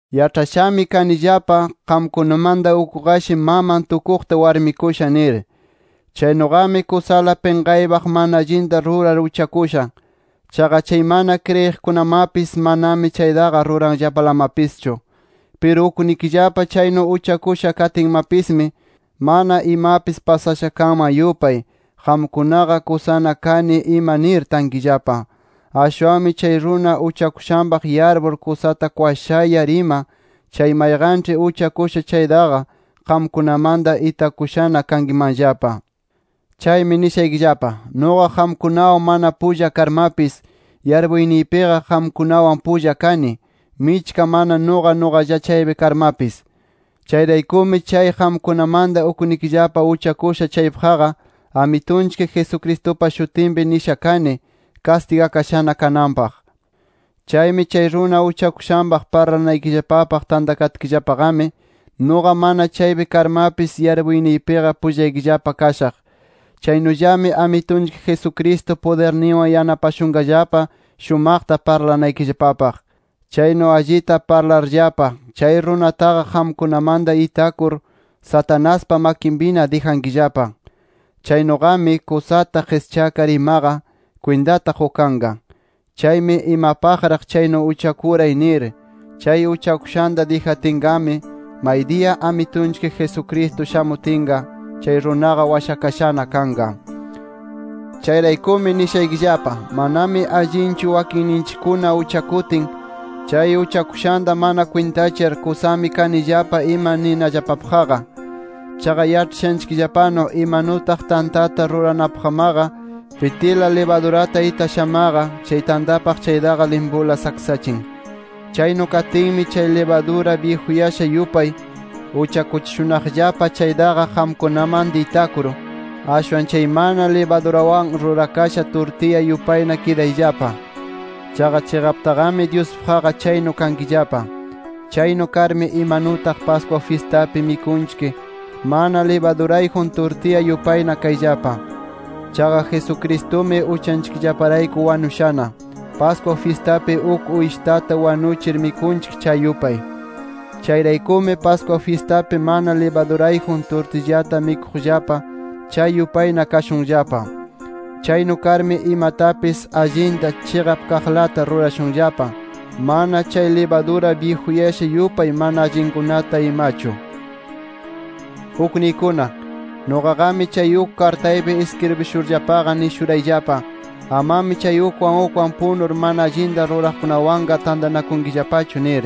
Yaĉhashami kanillapa, qamkunamanta ukqashi, maman tukuqta warmikusha nir. Chaynuqami kusala pinqaypaq mana allinta rurar uchakusha. Chaqa chay mana kriyiqkunamapis, manami chaytaqa ruranllapalamapischu. ¡Piru uknikillapa chaynu uchakusha katinmapismi, mana imapis pasasha kanman yupay, qamkunaqa kusana kani ima nir tankillapa! Ashwanmi chay runa uchakushanpaq yarpur kusata kwashayar ima, chay mayqanĉhi uchakusha chaytaqa qamkunamanta itakushana kankimanllapa. Chaymi nishaykillapa: Nuqa qamkunawan mana pulla karmapis, yarpuyniypiqa qamkunawan pulla kani, michka mana nuqa nuqalla chaypi karmapis. Chayraykumi, chay qamkunamanta uknikillapa uchakusha chaypaqqa, Amitunchik Jesucristupa shutinpi nishana kani kastigakashana kananpaq. Chaymi chay runa uchakushanpaq parlanaykillapapaq tantakatkillapaqami, nuqa mana chaypi karmapis yarpuyniypiqa pullaykillapa kashaq. Chaynullami Amitunchik Jesucristo pudirninwan yanapashunqallapa shumaqta parlanaykillapapaq. Chaynu allita parlarllapa, chay runataqa qamkunamanta itakur, Satanaspa makinpina dijankillapa. Chaynuqami, kusata qischakar imaqa, kwintata qukanqa. Chaymi imapaqraq chaynu uchakuray nir, chay uchakushanta dijatinqami, maydiya Amitunchik Jesucristo shamutinqa, chay runaqa washakashana kanqa. Chayraykumi nishaykillapa: Manami allinchu wakinninchikkuna uchakutin, chay uchakushanta mana kwintachar, kusami kanillapa ima ninallapapaqqa. Chaqa yaĉhashanchikllapanu, imanutaq tantata ruranapaqmaqa pitila libadurata itashamaqa, chay tantapaq chaytaqa limpula saksachin. Chaynu katinmi, chay libadura byijuyasha yupay, uchakuchishunaqllapa chaytaqa qamkunamanta itakur, ashwan chay mana libadurawan rurakasha turtilla yupayna kidayllapa. Chaqa chiqaptaqami Dyuspaqqa chaynu kankillapa. Chaynu karmi, imanutaq Pascua fyistapi mikunchik mana libadurayjun turtilla yupayna kayllapa. Chaqa Jesucristumi uchanchikllaparayku wanushana, Pascua fyistapi uk uyshitata wanuchir mikunchik chay yupay. Chayraykumi, Pascua fyistapi mana libadurayjun turtillata mikuqllapa, chay yupayna kashunllapa. Chaynu karmi imatapis allinta, chiqap kaqlata rurashunllapa, mana chay libadura byijuyasha yupay mana allinkunata imachu. Ukniykuna, nuqaqami chay uk kartaypi iskribishurllapaqa, nishurayllapa, amami chay ukwan ukwan punur, mana allinta ruraqkunawanqa tantanakunkillapachu nir.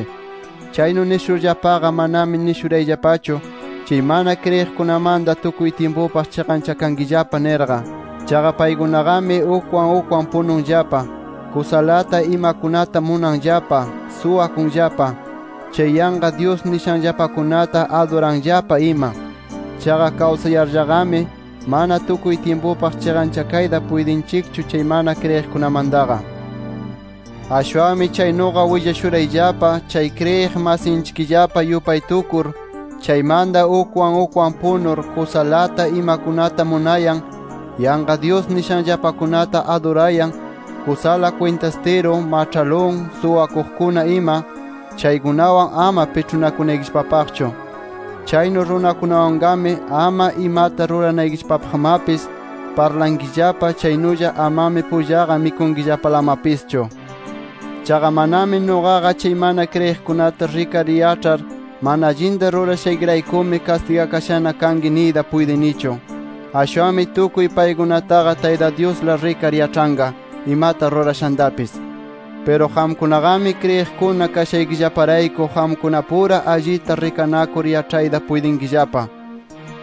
Chaynu nishurllapaqa, manami nishunarayllapachu, chay mana kriyiqkunamanta tukuy tyimpupaq chiqanchakankillapa nirqa. Chaqa paykunaqami, ukwan ukwan pununllapa, kusalata imakunata munanllapa, suwakunllapa, chay yanqa dyus nishanllapakunata aduranllapa ima. Chaqa kawsayarllaqami, mana tukuy tyimpupaq chiqanchakayta puytinchikchu chay mana kriyiqkunamantaqa. Ashwanmi chaynuqa willashurayllapa, chay kriyiq masinchikllapa yupay tukur, chaymanta ukwan ukwan punur, kusalata imakunata munayan, yanqa dyus nishanllapakunata adurayan, kusala kwintastiru, maĉhalun, suwakuqkuna ima, chaykunawan ama piĉhunakunaykillapapaqchu. Chaynu runakunawanqami, ama imata ruranaykillapapaqmapis parlankillapa, chaynulla amami pullaqa mikunkillapalamapischu. Chaqa manami nuqaqa chay mana kriyiqkunata rikar yaĉhar, mana allinta rurashaykiraykumi kastigakashana kanki niyta puytinichu. Ashwanmi tukuy paykunataqa Tayta Dyusla rikar yaĉhanqa imata rurashantapis. Piru qamkunaqami kriyiqkuna kashaykillaparayku qamkunapura allita rikanakur yaĉhayta puytinkillapa.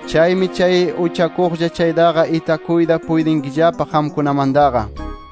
Chaymi chay uchakuqlla chaytaqa itakuyta puytinkillapa qamkunamantaqa.